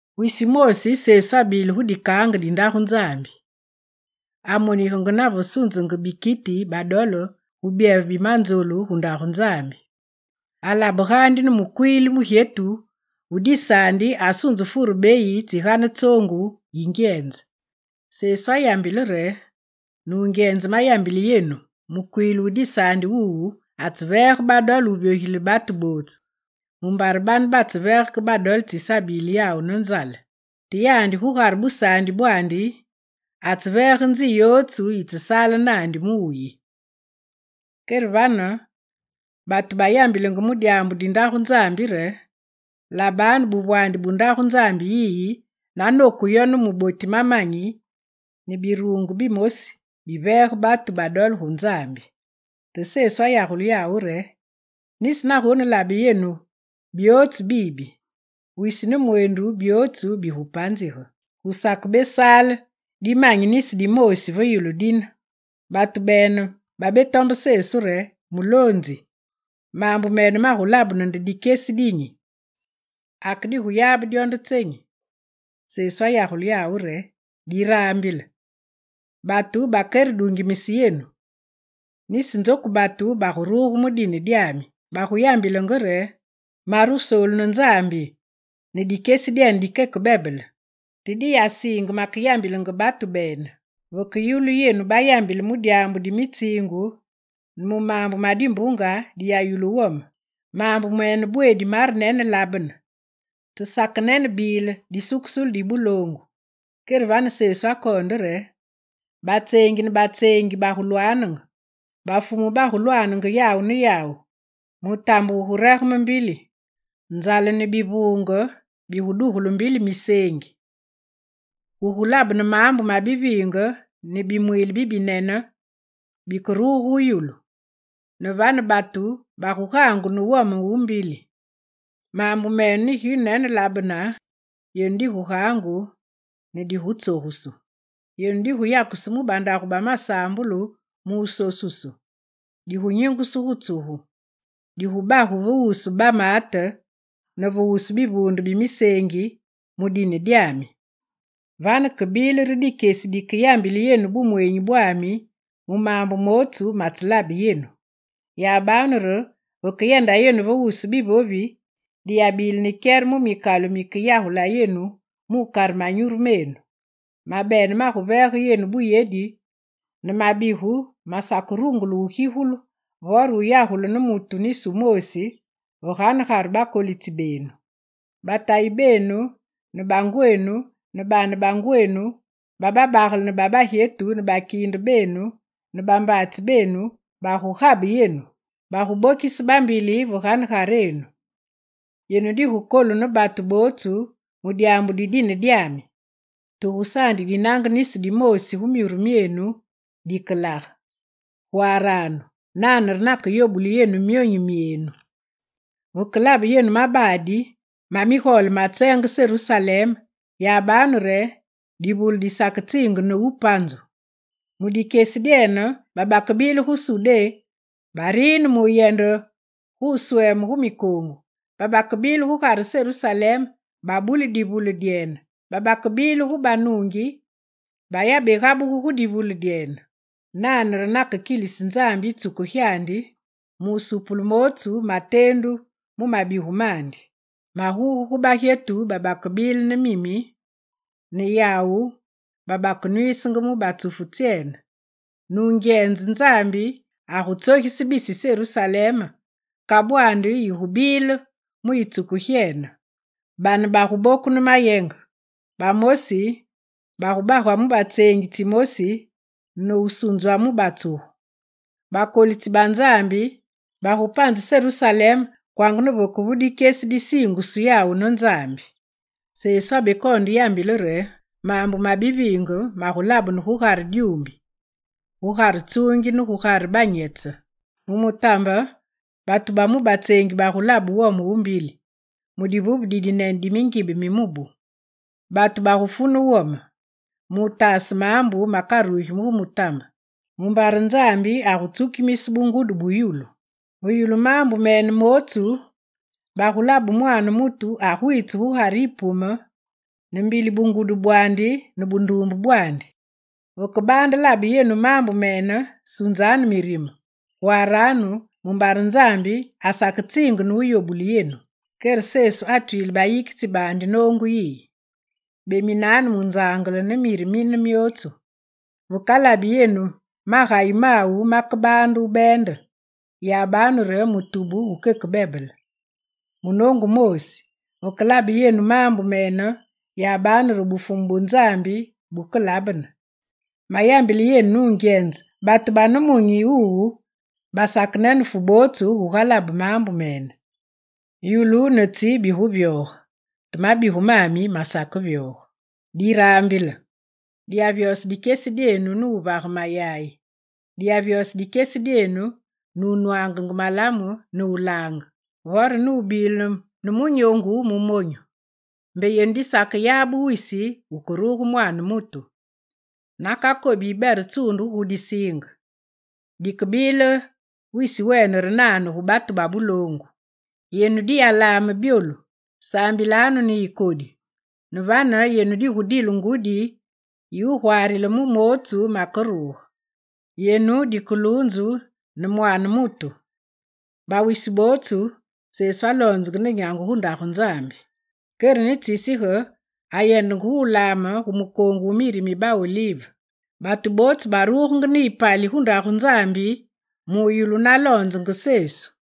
Wisi wumoosi, Sesu abile gu dikaange di Ndagu Nzambi, amonigenge nave sunzenge bikiti badole gu byeve bi manzolu gu Ndagu Nzambi. Alabe keke ne mukwiili mugyetu wu disaandi asunze fure beyi tsigane tsoongu yingyenze. Sesu ayambile re: «Nungyenze mayambile yenu, mukwiili wu disaandi wuwu atseveege badole wuvyogilile batu bootsu. Mumbare bane batseveege ke badole tsisabile yawu ne nzale. Te yandi gugare busaandi bwaandi, atseveege nzi yotsu yitsesaale naandi mu wuyi.» Kere vane batu bayambilenge mu dyaambu di Ndagu Nzambi re: «Labanu buvwaandi bu Ndagu Nzambi yiyi na noku yo ne muboti mamanyi, ne biruungu bimosi biveege batu badole gu Nzambi.» Te Sesu ayagule yawu re: «Nisi nagonelabe yenu byootsu bibi, wisi ne mweendu byootsu bigupanzige, gusakesaale dimanyi nisi dimoosi ve yulu dine.» Batu bene babetombe Sesu re: «Muloonzi, maambu mene magulabene nde dikyesi dinyi? Ake diguyabe dyo nde tsenyi?» Sesu ayagule yawu re: «Diraambile, batu bakeredungimise yenu. Nisi nzoku batu baguruge mu dine dyami, baguyambilenge re: “Mare wusoolu ne Nzambi!” ne: “Dikyesi dikeke bebele!” Te diyasiinge makeyambilenge batu bene. Vakeyulu yenu bayambile mu dyaambu di mitsiingu ne mu maambu ma dimbuunge, diyayulu wome. Maambu mene bweedi marenenelabene, te sakenenebile disukusulu di buloongu.» Kere vane Sesu akoonde re: «Batseengi ne batseengi bagulwaanenge, bafumu bagulwaanenge yawu ne yawu. Mutambe wuguregeme mbili. Nzale ne bivuunge bigudugulu mbili miseengi. Gugulabene maambu ma biviinge ne biliimbe bibinene bikeburugu gu yulu. Ne vane batu bagugaangu ne wome wu mbili. Maambu mene negiwunenelabene yenu digugaangu, ne digutsogusu. Yenu diguyakusu mu bandagu ba masaambulu mu wusosusu. Digunyingusu gu tsugu, digubagu ve wusu bamaate ne ve wusu bivuunde bi miseengi, mu dine dyami. Vane kebile re dikyesi dikeyambile yenu bumweenyi bwami mu maambu mootsu matselabe yenu. Yabanu re vekeyenda yenu ve wusu bivovi, diyabile ne kyere mu mikalu mikeyagula yenu mukare manyuru menu. Mabene maguveege yenu buyedi ne mabigu masakerungule wugigulu vore wuyagulu ne mutu nisi wumoosi ve ganegare bakolitsi benu. Batayi benu ne bangwenu ne baane bangwenu ba babagele ne ba bagyetu ne bakiinde benu ne bambaatsi benu bagugabe yenu, bagubokise bambili ve ganegarenu. Yenu digukolu ne batu bootsu mu dyaambu di dine dyami. Te gusaandi dinange nisi dimoosi gu myuru myenu dikelage. Gwaaranu: nane re nakeyobule yenu myonyu myenu. Vekelabe yenu mabaadi ma migole bamatseenge Serusalem, yabanu re, divule disaketsiinge nupanzu. Mu dikyesi dyene babakebile gu Sudé barine mu wuyende gu wusweeme gu mikoongu, babakebile gugare Serusalem babuli divule dyene, babakebile gu banuungi bayabegabugu gu divule dyene. Nane re nakekilise Nzambi yitsuku gyandi, mu wusupule mootsu mateendu mu mabigu mandi. Maguge gu bagyetu babakebile ne mimi ne gu yawu babakenwiisenge mu batsufu tsyene! Nungyenze, Nzambi agutsogise bisi Serusalem, kabwandi yigubile mu yitsuku gyene. Bane baguboku ne mayenge, bamosi bagubagwa mu batseengi tsimosi ne wusunzwa mu batsugu. Bakolitsi ba Nzambi bagupanze Serusalem kwanga ne vekevu dikyesi disiingusu yawu ne Nzambi.» Sesu abekoonde yambile re: «Maambu ma biviinge magulabene gugare dyumbi, gugare tsuungi ne gugare banyetse. Mu mutambe, batu ba mu batseengi bagulabe wome wu mbili, mu divuve didinene di mingibe mi mubu. Batu bagufu ne wome, mutaase maambu makarugi gu mutambe, mumbare Nzambi agutsukimise bungudu bu yulu. Ve yulu maambu mene mootsu, bagulabe Mwaane mutu agwiitse gu Gugare yipume, ne mbili bungudu bwaandi ne bunduumbe bwaandi. Vekebaande labe yenu maambu mene, sunzanu mirime, gwaaranu mumbare Nzambi asaketsiinge ne wuyobule yenu.» Kere Sesu atwile bayikitsi baandi noongu yiyi: «Beminanu munzangele ne miri mine myootsu. Vekalabi yenu magayi mawu makebaande wubeende, yabanu re mutubu wukeke bebele. Munoongu wumoosi, vekelabe yenu maambu mene yabane re Bufumu bu Nzambi bukelabene. Mayambile yenu nungyenze batu ba nemunyi wuwu basakenenefu bootsu gugalabe maambu mene. Yulu ne tsi biguvyoge, te mabigu mami masakevyoge. Diraambile! Diyavyose dikyesi dyenu ne wuvage mayayi, diyavyose dikyesi dyenu ne wunwange malamu ne wulange, vore ne wubile ne munyoongu mu monyu, mbe yenu disakeyabe wisi wukeruge Mwaane mutu. Nakakobi yibere tsundugu gu disiinge, dikebile wisi wene re nane gu batu ba buloongu. Yenu diyalaame byolu saambilenganu ne yikodi. Ne vane yenu digudile ngudi yi wugwaarile mu mootsu makeruge. Yenu dikeluunzu ne Mwaane mutu.» Bawisi bootsu Sesu aloonzenge ne nyangu gu Ndagu Nzambi. Kere ne tsisige, ayendenge gu wulaame gu mukoongu wu miri mi ba olive. Batu bootsu barugenge ne yipali gu Ndagu Nzambi mu yulu naloonzenge Sesu.